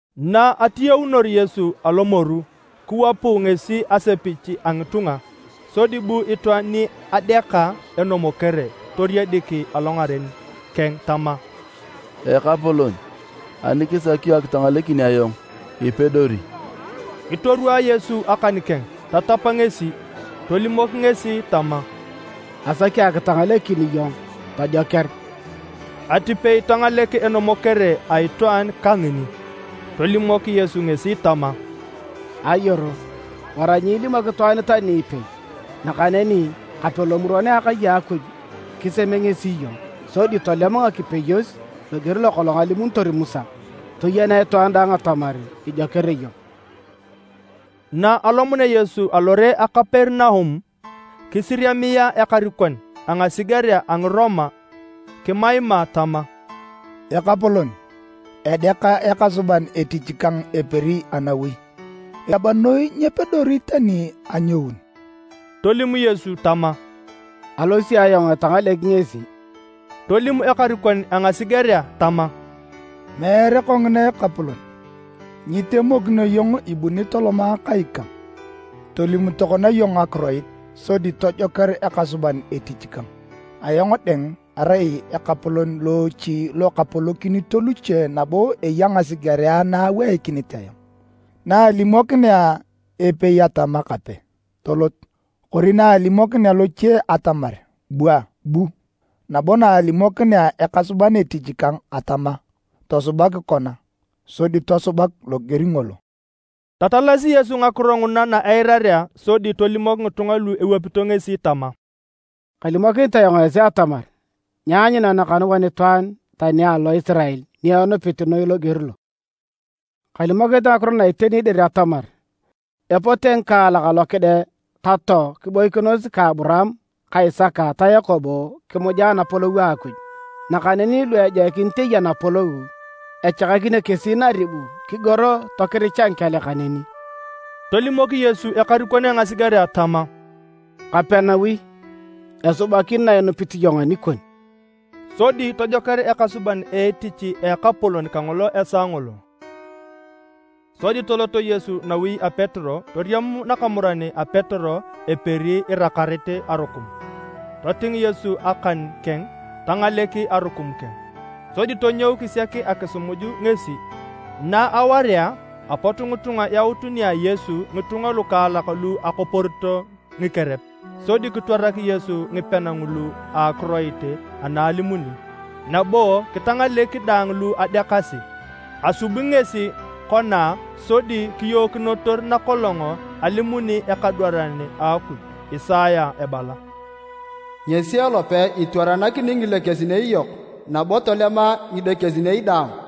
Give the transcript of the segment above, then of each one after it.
Na atiyaunor Yesu alomoru, kiwapu ngesi asepich a ngitunga. Sodi bu itwaan ni adeaka enomokere toriedik alongaren keng tama, “Ekapolon, ani kisaki iyong akitangalekin ayong, ipedori.” Kitorwaa Yesu akan keng tatap ngesi. Tolimok ngesi tama, “Asaki akitangalekin iyong, tojoker.” Atipei tangalek enomokere a itwaan kangini. Tolimok Yesu ngesi tama, “Ayoro, wara nyiilimok itwaan tani ipei nakaneni kape lomuron a akai a Akuj kiseme ngesi iyong, sodi tolem akipeyos loger lokolong alimunitor Musa, toyenea itwaan daang atamar ijoker iyong.” Na alomunea Yesu lore a Kaperinaum, kisiriamia ekarikon a ngasigerea a Ngiroma kimaima tama, “Ekapolon, edeaka ekasuban etich kang eperi anawi, eriab noi nyepedori tani anyoun.” Tolim Yesu tama, “Alosi ayong etangalek ngesi.” Tolim ekarikon a ngasigerea tama, “Meere kongina Ekapolon. Nyitemokino iyong ibuni toloma kai kang. Tolim tokona iyong akiroit, sodi tojoker ekasuban etich kang. Ayong dang, arai ekarikon loochi lo kapolokinito luche nabo eya ngasigerea na aweikinit ayong. Na alimokinea epei atama, ‘Kape!’ tolot. Kori na alimokinea loche atamar: ‘Bua’, bu. Nabo na alimokinea ekasuban etich kang atama, ‘Tosubak kona’, sodi tosubak loger ngolo.” Tatalasi Yesu ngakiro nguna na eirarea, sodi tolimok ngitunga lu ewapito ngesi tama, “Kalimokinit ayong esi atamar, nyaanyuna nakanuan itwaan tani alo Isirael ni enupit noi loger lo. Kalimokinit ngakiro na iteni dir atamar epote ngikaalak alo kide ka too kiboikinos ka Aburaam ka Isaka ta Yakobo kimuja Anapolou a Akuj. Nakaneni lu ejoikinit eya napolou, echakakinio kesi naribu, kigoro tokiricha ngikel kaneni.” Tolimok Yesu ekarikon a ngasigerea tama, “Kape nawi, esubakin na inupit iyong anikon.” Sodi tojoker ekasuban etich a ekapolon kangolo esaa ngolo. Sodi tolot Yesu nawi a Petero toriam nakamuran a Petero eperi irakarit arukum. Toting Yesu akan keng, tangalek arukum keng. Sodi tonyou kisiak akisimuj ngesi. Na awaria, apot ngitunga yaut nia Yesu ngitunga lukaalak lu akoporito ngikerep, sodi kitwarak Yesu ngipean ngulu a akiroit ana alimuni, nabo kitangalek daang lu adeakasi. Asubi ngesi kona sodi kiyookinotor nakolong alimuni ekadwaran a Akuj Isaya ebala: “Ngesi elope etwaranakini ngilekesinei yok nabo tolema ngidekesinei daang.”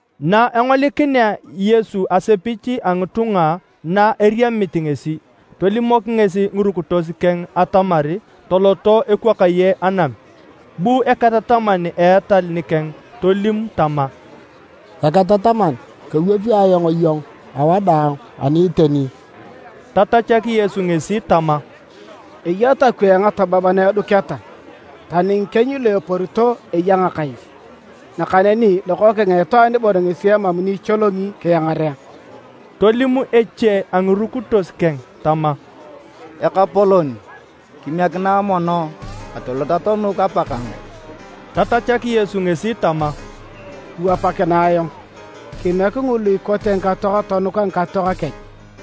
Na engolikinea Yesu asepich a ngitunga na eriamit ngesi, tolimok ngesi ngirukitos keng atamar toloto ekwakaye anam. Bu eketataman a etal nikeng tolim tama, “Eketataman, kewapi ayong iyong awadaang ani iteni.” Tatachak Yesu ngesi tama, “Eya takwee ngatabab na eduketa, tani ngikieny lu eporito eya ngakais, nakaneni Lokookeng a Itwaan bon ngesi emam ni icholongi kiangarea.” Tolim eche a ngirukitos keng tama, “Ekapolon, kimiekinae mono atolot atonuk apakang.” Tatachak Yesu ngesi tama, “Kiwapakinae ayong. Kimiek ngulu ikote ngikatoak tonuka ngikatoak kech.”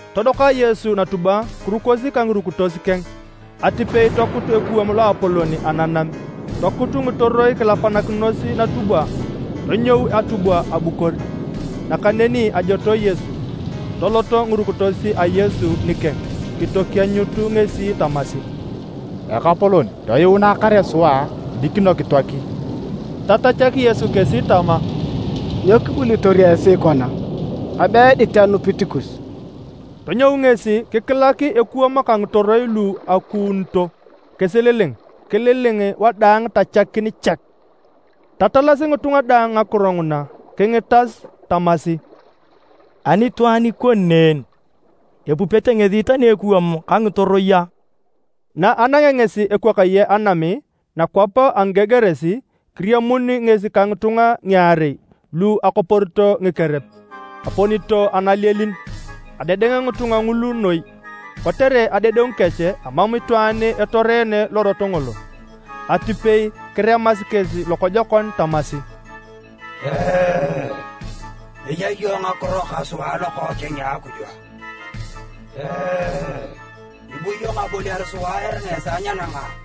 Todoka Yesu natubwa kirukosi ka ngirukitos keng. Atipei tokut ekuwam loapolon ananam, tokuut ngitoroi kilapanakinos natubwa, tonyou atubwa abukor. Nakaneni ajotoe Yesu. Toloto ngirukitos a Yesu nikeng kitokienyut ngesi tamasi, “Ekapolon, toyuunae kare sua dikino kitoaki.” Tatachak Yesu kesi tama, “Nyo kibulitor esi kona? Abe edit anupit kus.” Tonyou ngesi kikilak ekuwam ka ngitoroi lu akuunito kisililing. Kililing wadaang tachakin chek. Tatalasi ngitunga daang ngakiro nguna kingitas tamasi, “Ani itwaan ikoni ne en? Epupete ngesi tani ekuwam ka ngitoroi a?” Na anangea ngesi ekwakaye anam nakwap a Ngigerasi, kiriamun ngesi ka ngitunga ngiarei lu akoporito ngikerep, eponito analielin. Adedeng ngitunga ngulu noi. Kotere adedengu kech, amam itwaan etoreene lorot ngolo. Atipei kiremasi kesi lokojokon tamasi, “Eya iyong ngakiro ka sua Lokookeng a Akuj a? Ibu iyong aboliar sua eringa esaa nyenanga a?”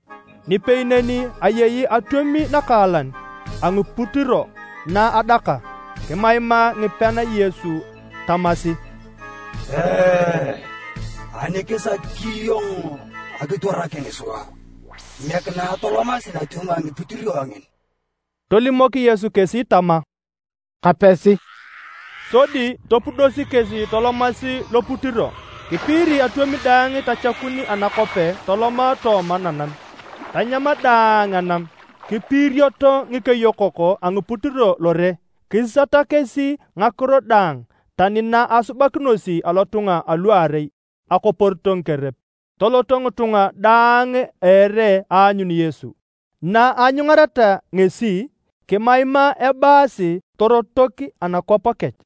Nipei neni ayei atwom nakaalan a ngiputiro na adaka. Kimaimaa ngipean Yesu tamasi, “Ani kisaki iyong akitwarakin sua, kimiekinae atolomasi natwom a ngiputiro ngin.” Tolimok Yesu kesi tama, “Kapesi.” Sodi topudosi kesi tolomasi loputiro. Kipiiri atwom daang tochakun anakope toloma tooma nanam, tanyam daang anam. Kipiirioto ngikeyokok a ngiputiro lore. Kisisata kesi ngakiro daang, tani na asubakinosi alotunga aluarei akoporito ngikerep. Toloto ngitunga daang a ere aanyun Yesu. Na anyungareta ngesi, kimaimaa ebaasi torotok anakwap kech.